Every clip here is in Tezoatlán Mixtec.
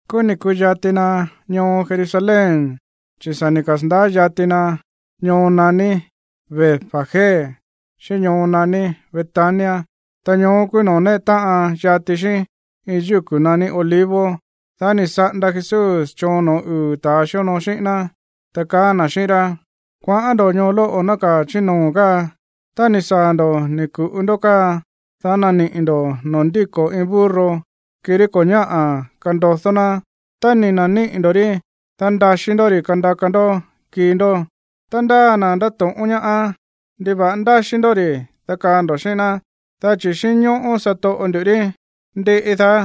Kúú ni̱ ku̱yati na ñoo Jerusalén, chi̱ sa̱ ni̱ kasa̱ndaá yati na ñoo naní Betfagé xíꞌín ñoo naní Betania. Ta ñoó kúú noo̱ néꞌe táꞌan yati xíꞌín iin yúku̱ naní Olivos. Dá ni̱ saꞌanda Jesús choon no̱ó uu̱ ta̱ xíonoo xíꞌín ná, ta kaá na̱ xíꞌín rá: ―Kuaꞌán ndo̱ ñoo lóꞌo̱ nákaa̱ chí noo̱ káa. Tá ni̱ saa̱ ndo̱ ni̱ ku̱ꞌu ndó káa, dá naniꞌi̱ ndo̱ noo̱ ndíko̱ iin burro, kirí ko̱ ñáꞌa̱ kandodó ná. Tá ni̱ na̱níꞌi̱ ndo̱ rí, dá ndaxí ndó ri̱ kandaka ndó kii ndó. Tá ndáa na̱ ndáto̱ꞌón ñáá: “¿Ndiva̱ꞌa ndáxí ndó ri̱?”, dá kaa ndo̱ xíꞌín ná: “Dá chi̱ xínñóꞌó satoꞌo ndu̱ rí, ndiꞌi daá,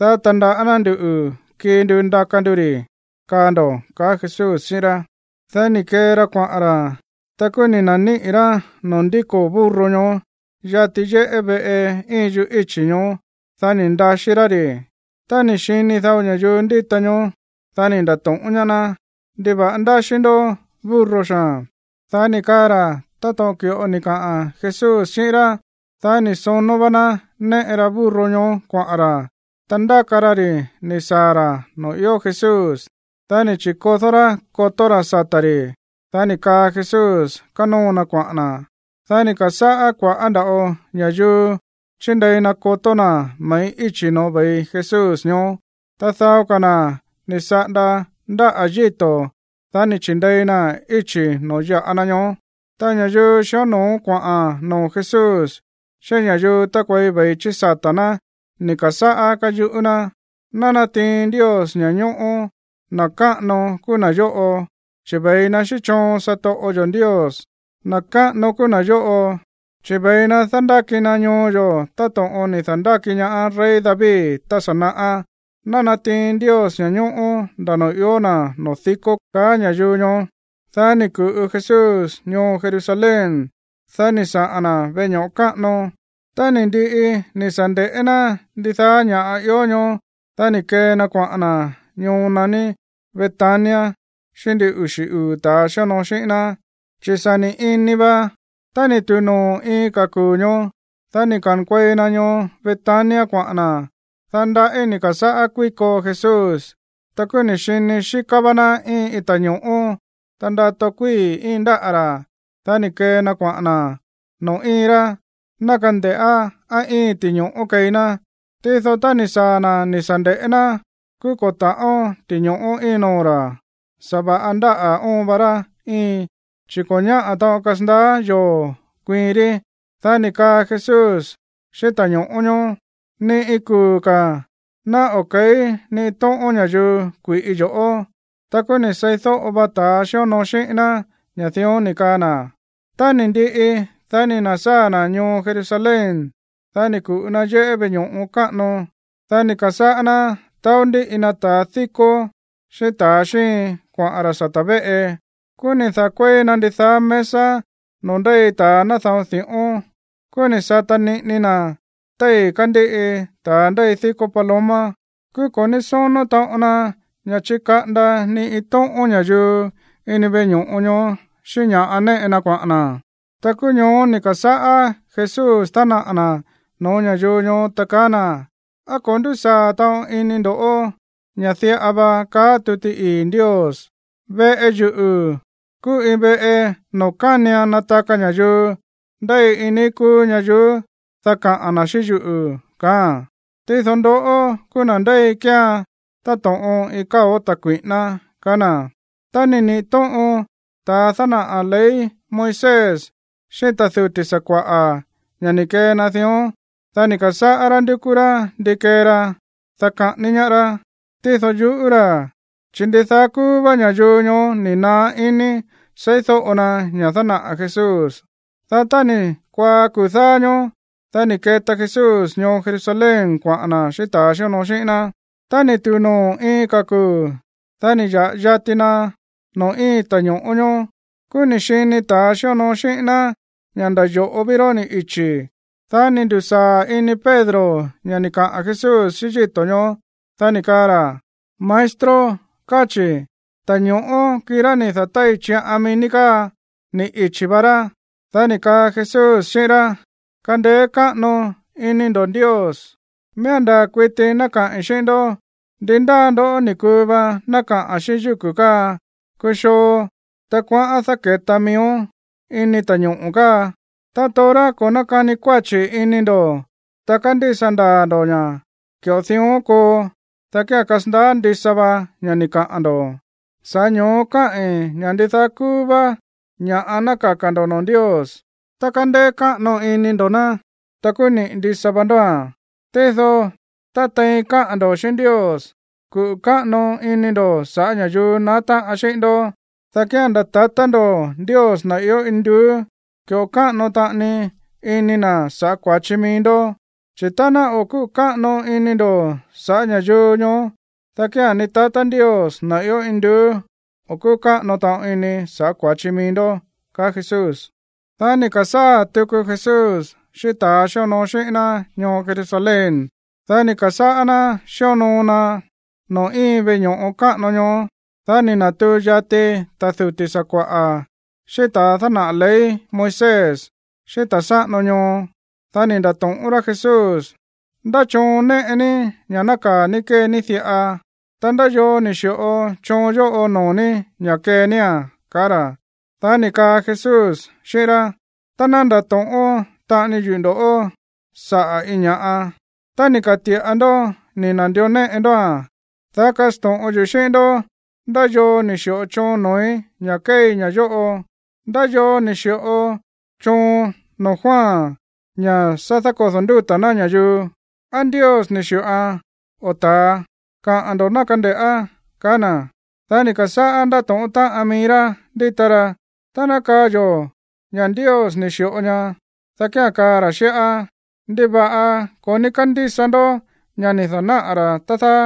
dá tandaꞌá ná ndu̱ kii ndu ndaka ndu ri̱”, kaa ndo̱ ―ka̱á Jesús xíꞌín rá. Dá ni̱ kee ra kuaꞌa̱n ra̱. Ta kúú ni̱ na̱níꞌi̱ rá noo̱ ndíko̱ burro ñoó yati yéꞌé veꞌe íin yuꞌú íchi̱ ñoó. Dá ni̱ ndaxí rá ri̱. Tá ni̱ xini dao ña̱yuu ndíta ñoó, dá ni̱ nda̱to̱ꞌón ñaá ná: ―¿Ndiva̱ꞌa ndáxí ndó burro xaa̱n? Dá ni̱ kaa ra̱ táto̱ꞌon ki̱ꞌo ni̱ kaꞌa̱n Jesús xíꞌín rá. Dá ni̱ sonó vá ná néꞌe ra burro ñoó kuaꞌa̱n ra̱. Ta ndáka ra ri̱ ni̱ saa̱ ra̱ noo̱ ió Jesús, dá ni̱ chi̱kodó rá kotó ra̱ sata̱ ri̱. Dá ni̱ kaa Jesús kanóo na kuaꞌa̱n na̱. Dá ni̱ ka̱sáꞌá kua̱ꞌá nda̱ꞌo ña̱yuu chíndei na kotó na̱ me̱ꞌí íchi̱ no̱ó ve̱i Jesús ñoó. Ta dao ka̱ na̱ ni̱ saꞌanda ndáꞌa̱ yíto̱, dá ni̱ chi̱ndei naa̱n íchi̱ no̱ó ya̱ꞌa na ñoó. Ta ña̱yuu xió no̱ó kuaꞌa̱n noo̱ Jesús xíꞌín ña̱yuu tákuei ve̱i chí sata̱ ná ni̱ ka̱sáꞌá káyuꞌú ná: ―¡Ná natiin Ndios ña̱ñóꞌó! ¡Na̱ káꞌano kúú na̱ yóꞌo, chi̱ ve̱i na xíꞌín choon satoꞌo yo̱ Ndios! ¡Na̱ káꞌano kúú na̱ yóꞌo, chi̱ ve̱i na dándáki na ñoo yo̱ táto̱ꞌon ni̱ da̱ndáki ñaá rey David tá sa̱ naꞌá! ¡Ná natiin Ndios ña̱ñóꞌó nda̱ noo̱ ió na̱ noo̱ dikó! ―ka̱á ña̱yuu ñoó. Dá ni̱ ku̱ꞌu Jesús ñoo Jerusalén. Dá ni̱ saꞌa̱n na̱ veꞌe ño̱ꞌo káꞌano. Tá ni̱ ndiꞌi ni̱ sa̱ nde̱ꞌé ná ndidaá ña̱ꞌa ió ñoó, dá ni̱ kee na kuaꞌa̱n na̱ ñoo naní Betania xíꞌín ndin uxi̱ uu̱ ta̱a xíonoo xíꞌín ná, chi̱ sa̱ ni̱ ini va. Tá ni̱ tu̱u noo̱ iin ka̱ kuu̱ ñoó, dá ni̱ ka̱nkuei na ñoo Betania kuaꞌa̱n na̱. Dá ndaꞌí ni̱ ka̱sáꞌá kuíko Jesús. Ta kúú ni̱ xini xíká vá ná íin iin ta̱ño̱ꞌó, ta ndato kuíi̱ íin ndáꞌa̱ ra̱. Dá ni̱ kee na kuaꞌa̱n na̱ noo̱ íin rá, ná kande̱ꞌá á íin ti̱ño̱ꞌó keí ná. Tído tá ni̱ saa̱ na̱ ni̱ sa̱ nde̱ꞌé ná, kúú ko̱ ta̱ꞌón ti̱ño̱ꞌó íin noo̱ ra̱. Sa̱va̱ꞌa ndáꞌa̱ óon va rá íin, chi̱ ko̱ ñáꞌa̱ taꞌon kasandaá yoo̱ kuiin rí. Dá ni̱ kaa Jesús xíꞌín ta̱ño̱ꞌó ñoó: ―¡Ni iin kuu̱ ka̱ ná o̱ ke̱í ni iin tóꞌón ña̱yuu kui̱ꞌi yo̱ꞌó! Ta kúú ni̱ seídóꞌo va ta̱ xíonoo xíꞌín ná ña̱ dión ni̱ kaa na̱. Tá ni̱ ndiꞌi, dá ni̱ na̱sáa̱ na̱ ñoo Jerusalén. Dá ni̱ ku̱ꞌu na yéꞌé veꞌe ño̱ꞌo káꞌano. Dá ni̱ ka̱sáꞌá ná taó ndíꞌi na ta̱ díkó xíꞌín ta̱ xíin kuaꞌa̱n ra̱ sata̱ véꞌe. Kúú ni̱ da̱kuéi na ndidaá mesa noo̱ ndéi ta̱a náda̱on di̱ꞌón. Kúú ni̱ sata niꞌini na téi̱ kándíꞌi ta̱a ndéi díkó paloma. Kúú ko̱ ní sónó taꞌon na ña̱ chikaꞌanda ni iin tóꞌón ña̱yuu ini yéꞌé veꞌe ño̱ꞌo ñoó xíꞌín ña̱ꞌa néꞌe na kuaꞌa̱n na̱. Ta kúú ñoó ni̱ ka̱sáꞌá Jesús dánaꞌa̱ na̱ no̱ó ña̱yuu ñoó, ta kaá na̱: ―¿Á ko̱ ndúsaa̱ taꞌon ini ndo̱ ña̱ diꞌa va kaá tuti ii̱ Ndios: “Veꞌe yuꞌu̱ kúú iin veꞌe noo̱ kánian nataka ña̱yuu ndéi iin níí kúú ñayuú, dá kaꞌa̱n na̱ xíꞌín yuꞌu̱”, kaáa̱n? Tído ndoꞌó kúú na̱ ndéi kéean táto̱ꞌon iin káo̱ ta̱ kui̱ꞌíná ―kaá na̱. Tá ni̱ niꞌi̱ tóꞌon ta̱a dánaꞌa̱ ley Moisés xíꞌín ta̱ duti̱ sakua̱ꞌa̱ ña̱ ni̱ kee na dión, dá ni̱ ka̱sáꞌá rá ndúkú rá ndi kee ra, dá kaꞌání ñaá rá. Tído yuꞌú ra̱, chi̱ ndidaá kúú vá ña̱yuu ñoó ni̱ naá iní seídóꞌo na ña̱ dánaꞌa̱ Jesús. Dá tá ni̱ kuaá kuu̱ dáá ñóó, dá ni̱ keta Jesús ñoo Jerusalén kuaꞌa̱n na̱ xíꞌín ta̱a xíonoo xíꞌín ná. Tá ni̱ tu̱u noo̱ iin ka̱ kuu̱, dá ni̱ ya̱ꞌa yati na noo̱ íin ta̱ño̱ꞌó ñóó, kúú ni̱ xini ta̱a xíonoo xíꞌín ná ña̱ nda̱ yo̱ꞌo ví rá ni̱ ichi̱. Dá ni̱ ndu̱sáa̱ ini Pedro ña̱ ni̱ kaꞌa̱n Jesús xíꞌín yíto̱ ñoó. Dá ni̱ kaa ra̱: ―Maestro, káa chi̱, ta̱ño̱ꞌó, kirá ni̱ da̱tái̱ chiꞌan mií ní káa, ni̱ ichi̱ va rá. Dá ni̱ kaa Jesús xíꞌín rá: ―Kandeé káꞌano iní ndo̱ Ndios. Miía̱n ndaa̱ kuiti ná kaꞌi̱n xíꞌín ndó; ndi ndáa ndoꞌó ni̱ kuu va ná kaꞌa̱n xíꞌín yúku̱ káa: “Kuxoo, ta kuaꞌán dáke̱tón miíón ini ta̱ñoꞌo̱ káa”, ta torá ko̱ nákani kuáchi̱ ini ndo̱, ta kándísa ndaa̱ ndo̱ ña̱ ki̱ꞌo dión koo, dá kía̱n kasandaá ndisa va ña̱ ni̱ kaꞌa̱n ndo̱. Sa̱ꞌá ño̱ó káꞌi̱n ña̱ ndidaá kúú vá ña̱ꞌa ná kaka̱ ndo̱ noo̱ Ndios, ta kándeé káꞌano ini ndo̱ ná, ta kúú niꞌi̱ ndisa va ndóa̱n. Tído tá tein káꞌa̱n ndo̱ xíꞌín Ndios, kuꞌu̱ káꞌano ini ndo̱ saꞌa̱ ña̱yuu naá táꞌan xíꞌín ndó, dá kía̱n nda̱ tatá ndo̱ Ndios, na̱ ió induú, ki̱ꞌo káꞌano taꞌani ini na̱ sa̱ꞌá kua̱chi mií ndó. Chi̱ tá ná o̱ kúꞌu̱ káꞌano ini ndo̱ sa̱ꞌá ña̱yuu ñoó, dá kía̱n ni tatá Ndios, na̱ ió induú, o̱ kúꞌu̱ káꞌano taꞌon ini sa̱ꞌá kua̱chi mií ndó ―kaá Jesús. Dá ni̱ ka̱sáa̱ tuku Jesús xíꞌín ta̱a xíonoo xíꞌín ná ñoo Jerusalén. Dá ni̱ ka̱sáꞌá ná xíonoo na noo̱ íin veꞌe ño̱ꞌo káꞌano ñoó. Dá ni̱ na̱tuu yati ta̱ duti̱ sakua̱ꞌa̱, xíꞌín ta̱ dánaꞌa̱ ley Moisés xíꞌín ta̱ sáꞌano ñoo. Dá ni̱ nda̱to̱ꞌón rá Jesús: ―¿Ndá choon néꞌe ní ña̱ nákaa̱ ní kée ní diꞌa? Ta, ¿ndá yoo ni̱ xi̱ꞌo choon yóꞌo noo̱ ní ña̱ kee nía̱n? ―kaá ra̱. Dá ni̱ kaa Jesús xíꞌín rá: ―Ta ná ndato̱ꞌón taꞌani yuꞌu̱ ndo̱ꞌó saꞌa̱ iin ña̱ꞌa. Tá ni̱ ka̱ti̱ꞌa ndó ni̱ na̱ndió néꞌe ndóa̱n, dá kasto̱ꞌon yuꞌu̱ xíꞌín ndó ndá yoo ni̱ xi̱ꞌo choon noo̱í ña̱ kéei ña̱ yóꞌo. ¿Ndá yoo ni̱ xi̱ꞌo choon noo̱ Juan ña̱ sa̱ da̱kódo̱ ndúta̱ ná ña̱yuu? ¿Á Ndios ni̱ xi̱ꞌoan, o ta̱a? Kaꞌa̱n ndo̱ ná kande̱ꞌá ―kaá na̱. Dá ni̱ ka̱sáꞌá ndátóꞌón táꞌan mií rá ndíta ra: ―Tá ná kaa yo̱ ña̱ Ndios ni̱ xi̱ꞌo ñaá, dá kía̱n kaa ra̱ xíꞌá: “¿Ndiva̱ꞌa ko̱ ní kándísa ndó ña̱ ni̱ da̱náꞌa̱ ra̱, tá dáá?”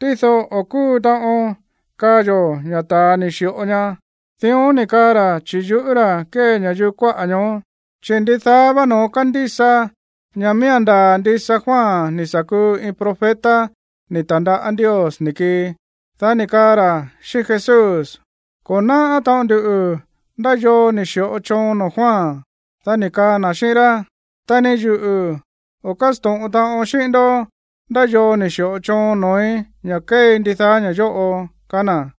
Tído, o̱ kúu taꞌon kaa yo̱ ña̱ ta̱a ni̱ xi̱ꞌo ñaá. Dión ni̱ kaa ra̱, chi̱ yuꞌú ra̱ kée ña̱yuu kuáꞌa̱ ñoó. Chi̱ ndidaá vá no̱ón kándísa ña̱ miía̱n ndaa̱ ndisa Juan ni̱ sa̱ kuu iin profeta ni̱ ta̱ndaꞌá Ndios ni̱ kii. Dá ni̱ kaa ra̱ xíꞌín Jesús: ―Ko̱ náꞌá taꞌon nduꞌu̱ ndá yoo ni̱ xi̱ꞌo choon noo̱ Juan. Dá ni̱ kaa na̱ xíꞌín rá: ―Ta ni yuꞌu̱ o̱ kásto̱ꞌon taꞌon xíꞌín ndó ndá yoo ni̱ xi̱ꞌo choon noo̱í ña̱ kéei ndidaá ña̱ yóꞌo ―kaá na̱.